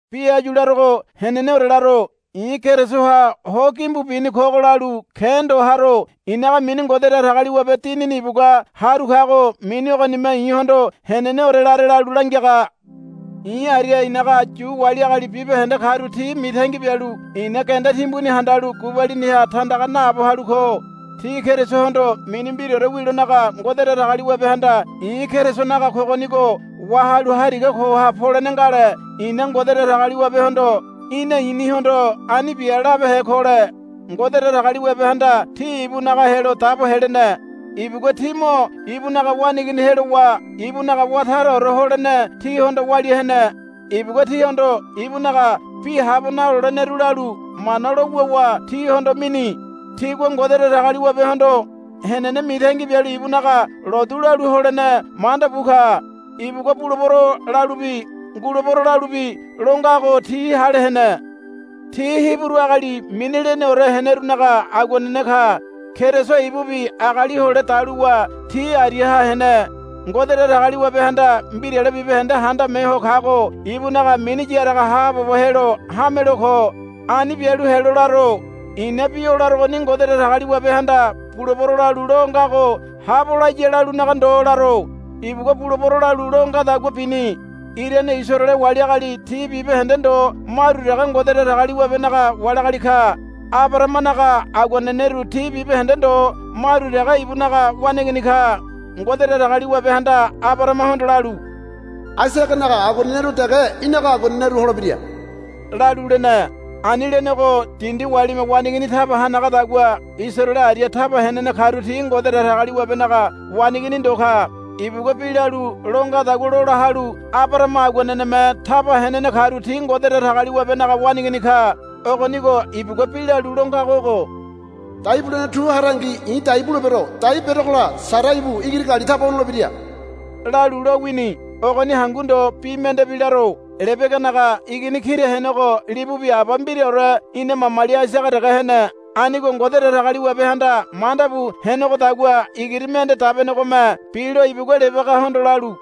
Bi áyu larogo heneneore laro. I̱ Kerisoha ho gimbu bini kogo lalu ke̱ ndo haro. i̱naga mini Ngode Datagaliwabe Dinini ibugua haru kago mini ogonime i̱hondo heneneore lare lalu langiaga. I̱ aria i̱naga Yu wali agali bibahende karu ti mitangi bialu i̱na genda timbuni handalu gubaliniha tandaga naabo halu ko. Ti Kerisohondo mini mbiraore wilonaga Ngode Datagaliwabehanda i̱ Kerisonaga kogonigo wahalu hariga koha polene ngale i̱na Ngode Datagaliwabehondo, Í̠na i̱nihondo ani bia, labehe kole. Ngode Datagaliwabehanda ti ibunaga helo dabo helene. Ibugua ti mo ibunaga waneigini helowa ibunaga wá taraore holene tihondo walia hene. Ibugua tihondo ibunaga bi habo naloleneru lalu Mana lo wuwa tihondo mini. Tigua Ngode Datagaliwabehondo henene mitangi bialu ibunaga lotu lalu holene manda bu ka. Ibugua, Bulebero, lalubi, Ngulebero, lalubi lo ngago ti hale hene. Ti Hiburu agali mini leneore henerunaga aguanene ka. Keriso ibubi agali hole daluwa ti ariaha hene. Ngode Datagaliwabehanda mbirale bibahende handame ho kago ibunaga mini yaraga haabobo helo hamelo ko. Ani bialu helo laro. I̱na bi o larogoni Ngode Datagaliwabehanda, Bulebero, lalu lo ngago habo laya lalunaga ndo laro. Ibugua, Bulebero, lalu lo ngadagua bini. Irane Isaraele wali agali ti bibahende ndo maru dege Ngode Datagaliwabenaga wali agali ka. Abarahamanaga aguaneneru ti bibahende ndo maru dege ibunaga waneigini ka. Ngode Datagaliwabehanda Abarahamahondo lalu, Aisaganaga aguaneneru dege í̠naga aguaneneru holebira, lalu lene. Ani lenego dindi walime waneigini taba hanagadagua Isaraele aria taba henene karu ti Ngode Datagaliwabenaga waneigini ndo ka. Ibugua bi lalu lo ngadagua lola halu Abarahama aguaneneme taba henene karu ti Ngode Datagaliwabenaga waneigini ka. Ogonigo ibuguabi lalu lo ngago ogo, Dai bulene tu harangi i̱ dai bulebero. Dai berogola Sara ibu igiri gali taba honolebira, lalu lo wini. Ogoni hangu ndo bi mendebi laro. Lebeganaga igini kira henego libubi aba mbiraore ina mamali Aisaga dege hene. Anigo Ngode Datagaliwabehanda manda bu henegodagua igiri mende dabenegome bilo ibugua Lebegahondo lalu,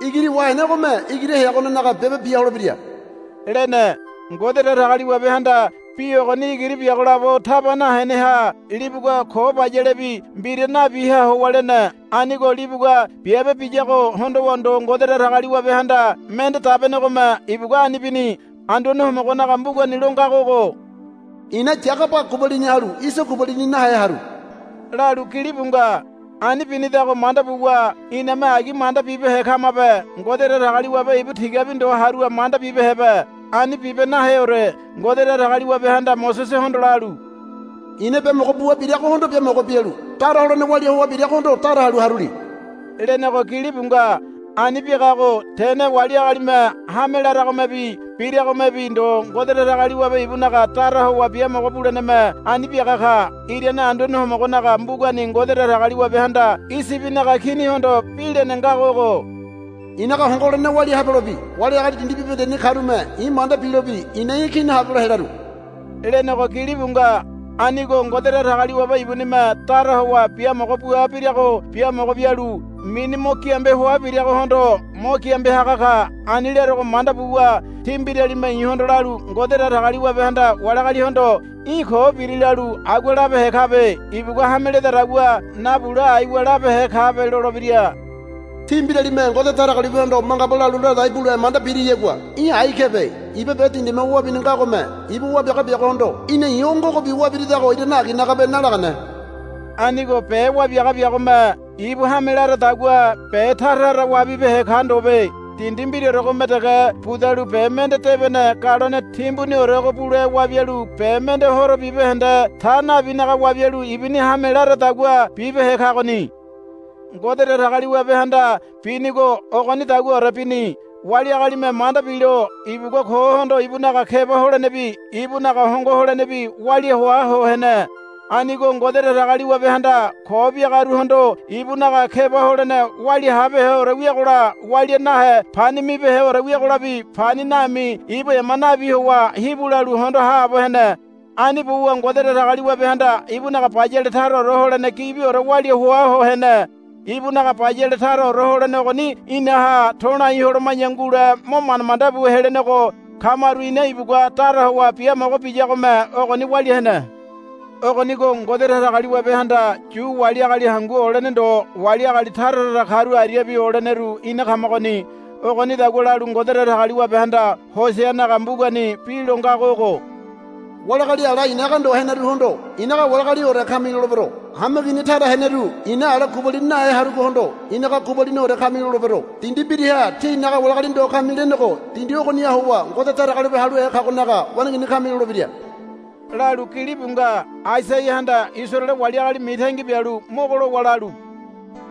Igiri wahenegome igiri heyogonenaga biabe bia holebira, lene. Ngode Datagaliwabehanda bi ogoni igiri biago labo taba naheneha libugua ko bayalebi mbira nabiha howa lene. Anigo libugua biabe biyago hondowa ndo Ngode Datagaliwabehanda mende dabenegome ibugua ani bini. Anduane Homogonaga mbugani lo ngago ogo, I̱na Yagaba gubalini halu Iso gubalini nahe haru, lalu gilibu nga. Ani binidago manda buwa iname agi manda bibehe kamabe. Ngode Datagaliwabe ibu tigabi ndo harua manda bibehebe. Ani bibe naheore. Ngode Datagaliwabehanda Mosesehondo lalu, I̱na biamogo bua biragohondo biamogo bialu dara holene walia hoa biragohondo dara halu haruli, lenego gilibu nga. Ani biagago tene wali agalime hame laragomebi biragomebi ndo Ngode Datagaliwabe ibunaga dara howa biamogo buleneme ani biaga ka. Irane Anduane Homogonaga mbugani Ngode Datagaliwabehanda Iyibinaga kinihondo bi lene ngago ogo, i̱naga hongo holene walia habelobi wali agali dindi bibahendeni karume i̱ manda bilobi i̱na í̠ kini habelo helaru, lenego gilibu nga. Anigo Ngode Datagaliwabe ibunime dara howa biamogo bua birago biamogo bialu mini mo giambe hoa biragohondo mo giambe haga ka. Ani larogo manda buwa tí mbiralime i̱hondo lalu, Ngode Datagaliwabehanda wali agalihondo, Í̠ ko biri, lalu agua labehe kabe. Ibugua hame ledadagua nabule aiwa labehe kabe, lolebira. Tí mbiralime Ngode Datagaliwabehondo mangaba lalu ladai bule manda biriyagua í̠ ai kebe. Iba be dindime wabini ngagome ibu wabiaga biagohondo, Í̠na i̱ o ngogobi wabiridago irane aginagabe, nalagane. Anigo be wabiaga biagome ibu hame laradagua be tara tara wabibehe ka ndobe. Dindi mbiraoregome dege budalu be mende debene galone timbuniorego bule wabialu be mende horo bibahende ta nabinaga wabialu ibuni hame laradagua bibehe kagoni. Ngode Datagaliwabehanda binigo ogonidaguaore bini. Wali agalime manda bilo ibugua kohondo ibunaga keba holenebi ibunaga hongo holenebi walia hoa ho hene. Anigo Ngode Datagaliwabehanda ko biagaruhondo ibunaga keba holene walia habeheore wiagola walia nahe pani mibeheore wiagolabi pani nami ibu ema nabi howa hibu lalu hondo haabo hene. Ani buwa Ngode Datagaliwabehanda ibunaga bayale taraore holene gibiore walia hoa ho hene. Ibunaga bayale taraore holene ogoni inaha to̱lai holoma̱ya ngule mo manda manda bu helenego kamaru ina ibugua dara howa biamogo biyagome ogoni walia hene. Ogonigo Ngode Datagaliwabehanda Yu wali agali hangu olene ndo wali agali tara tara karu ariabi oleneru ina kamagoni. Ogonidagua lalu Ngode Datagaliwabehanda Hoseanaga mbugani bi lo ngago ogo, Wali agali ala i̱naga ndo heneruhondo, i̱naga wali agaliore kami, lolebero. Hameigini tara heneru i̱na ala gubalini nahe harugohondo, i̱naga gubaliniore kami, lolebero. Dindi mbiraha, Tí i̱naga wali agali ndo kami, lenego dindi ogoniha howa, Ngode Datagaliwabe haluhe kagonaga waneigini kami, lolebira, lalu gilibu nga. Aisaiahanda Isaraele wali agali mitangi bialu mogo lowa lalu,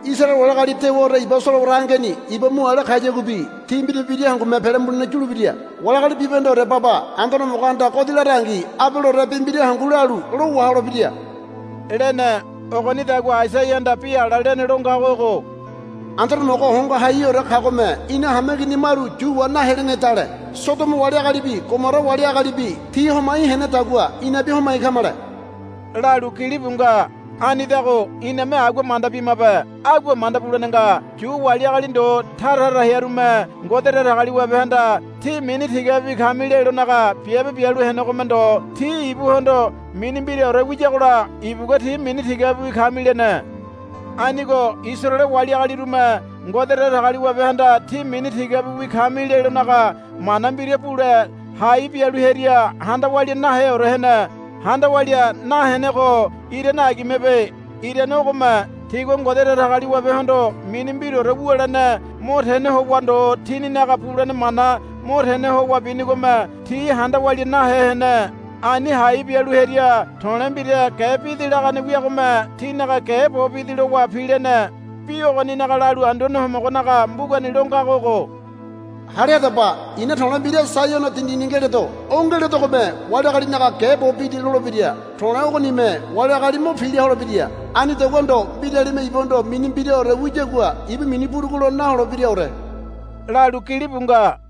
Isaraele wali agali dewaore iba solowara angeni iba mu ale kayaguabi ti mbira mbira hangume pele mulene yulebira. Wali agali bibahendeore baba Anduane Homogohanda godi larangi abaleore bi mbira hangu lalu lo waholebira, lene. Ogonidagua Aisaiahanda bi ala lene lo ngago ogo, Anduane Homogo Hongo Haiheore kagome ina hameigini maru yu wa nahelenedale Sodomo wali agalibi Gomora wali agalibi ti homai henedagua inabi homai kamale, lalu gilibu nga. Anidago iname agua manda bimabe. Agua manda bulene nga. Yu wali agali ndo tara tara hearume Ngode Datagaliwabehanda, Tí mini tigabiwi kami, lelonaga biabe bialu henegome ndo ti ibuhondo mini mbiraore wiyagola ibugua, Tí mini tigabiwi kami, lene. Anigo Isaraele wali agalirume Ngode Datagaliwabehanda, Tí mini tigabiwi kami, lelonaga mana mbira bule hai bialu hearia handa walia naheore hene. handa walia nahenego irane agimebe. Irane ogome tigua Ngode Datagaliwabehondo mini mbiraore wulene mo tene howa ndo tininaga bulene mana mo tene howa binigome ti handa walia nahe hene. Ani hai bialu hearia to̱le̱ mbira ge bidi lagane wiagome tinaga ge bo bidi lowa pilene. Bi ogoninaga lalu Anduane Homogonaga mbugani lo ngago ogo, Hale hadaba. I̱na to̱le̱ mbira Saiono dindini ngeledo. O ngeledogome wali agalinaga ge bo bidi lolebira. To̱le̱ ogonime wali agali mo pila holebira. Anidagua ndo mbiralime ibuhondo mini mbiraore wiyagua ibu mini burugulo naholebiraore, lalu gilibu nga.